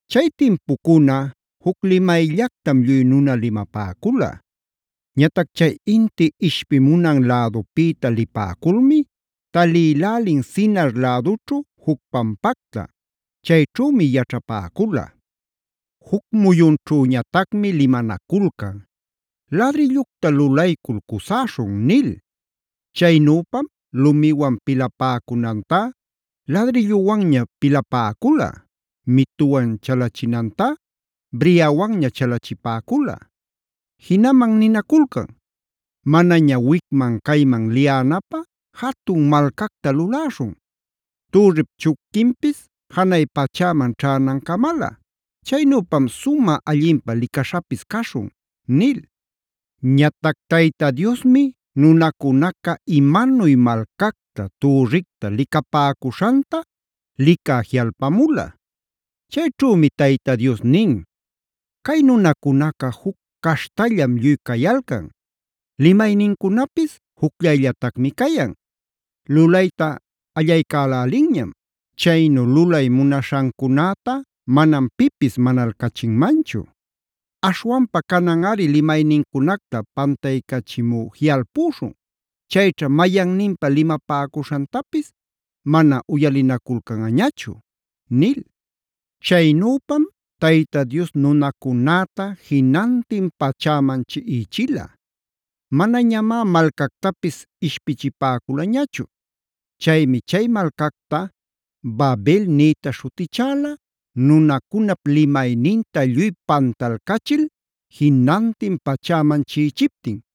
Chay timpucuna juc limayllactam lluy nuna limapäcula. Ñatac chay inti ishpimunan lädupïta lipäculmi talïlälin Sinar lädućhu juc pampacta; chayćhümi yaćhapäcula. Juc muyunćhüñatacmi limanaculcan: “Ladrillucta lulaycul cusäśhun” nil. Chaynüpam lumiwan pilapäcunantá ladrilluwanña pilapäcula; mituwan chalachinantá briawanña chalachipäcula. Jinaman ninaculcan: “Manaña wicman cayman liyänapä, jatun malcacta luläśhun; türrip chupquinpis janay pachäman ćhänancamalä. Chaynüpam sumä allinpä licaśhapis caśhun” nil. Ñatac Tayta Diosmi nunacunaca imanuy malcacta, türricta lulapäcuśhanta licä jiꞌalpamula. Chayćhümi Tayta Dios nin: “Cay nunacunaca juc caśhtallam lluy cayalcan; limaynincunapis jucllayllatacmi cayan. Lulayta allaycälälinñam; chaynu lulay munaśhancunäta manam pipis manalcachinmanchu. Aśhwanpa cananꞌari limaynincunacta pantaycachimü jiꞌalpuśhun; chayćha mayanninpa limapäcuśhantapis mana uyalinaculcanꞌañachu” nil. Chaynüpam Tayta Dios nunacunäta jinantin pachäman chiꞌichila; manañamá malcactapis ishpichipäculañachu. Chaymi chay malcacta “Babel” nïta śhutichäla, nunacunap limayninta lluy pantalcachil, jinantin pachäman chiꞌichiptin.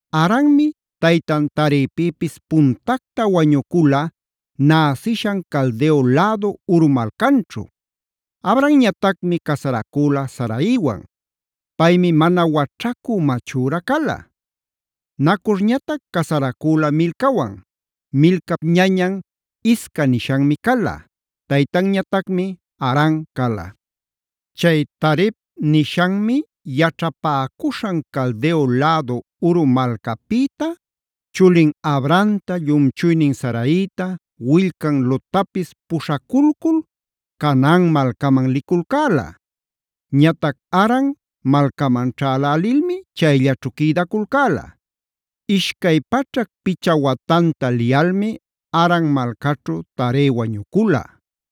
Haranmi taytan Tarepïpis puntacta wañucula näsishan Caldeo lädu Ur malcanćhu. Abramñatacmi casaracüla Saraiwan. Paymi mana waćhacü machüra cala. Nacorñatac casaracüla Milcawan. Milcap ñañan Isca nishanmi cala; taytanñatacmi Haran cala. Chay Tarep nishanmi yaćhapäcuśhan Caldeo lädu Ur malcapïta chulin Abramta llumchuynin Saraita, willcan Lottapis puśhaculcul Canaan malcaman liculcäla. Ñatac Haran malcaman ćhälälilmi chayllaćhu quïdaculcäla. Ishcay paćhac picha watanta liyalmi Haran malcaćhu Tare wañucula.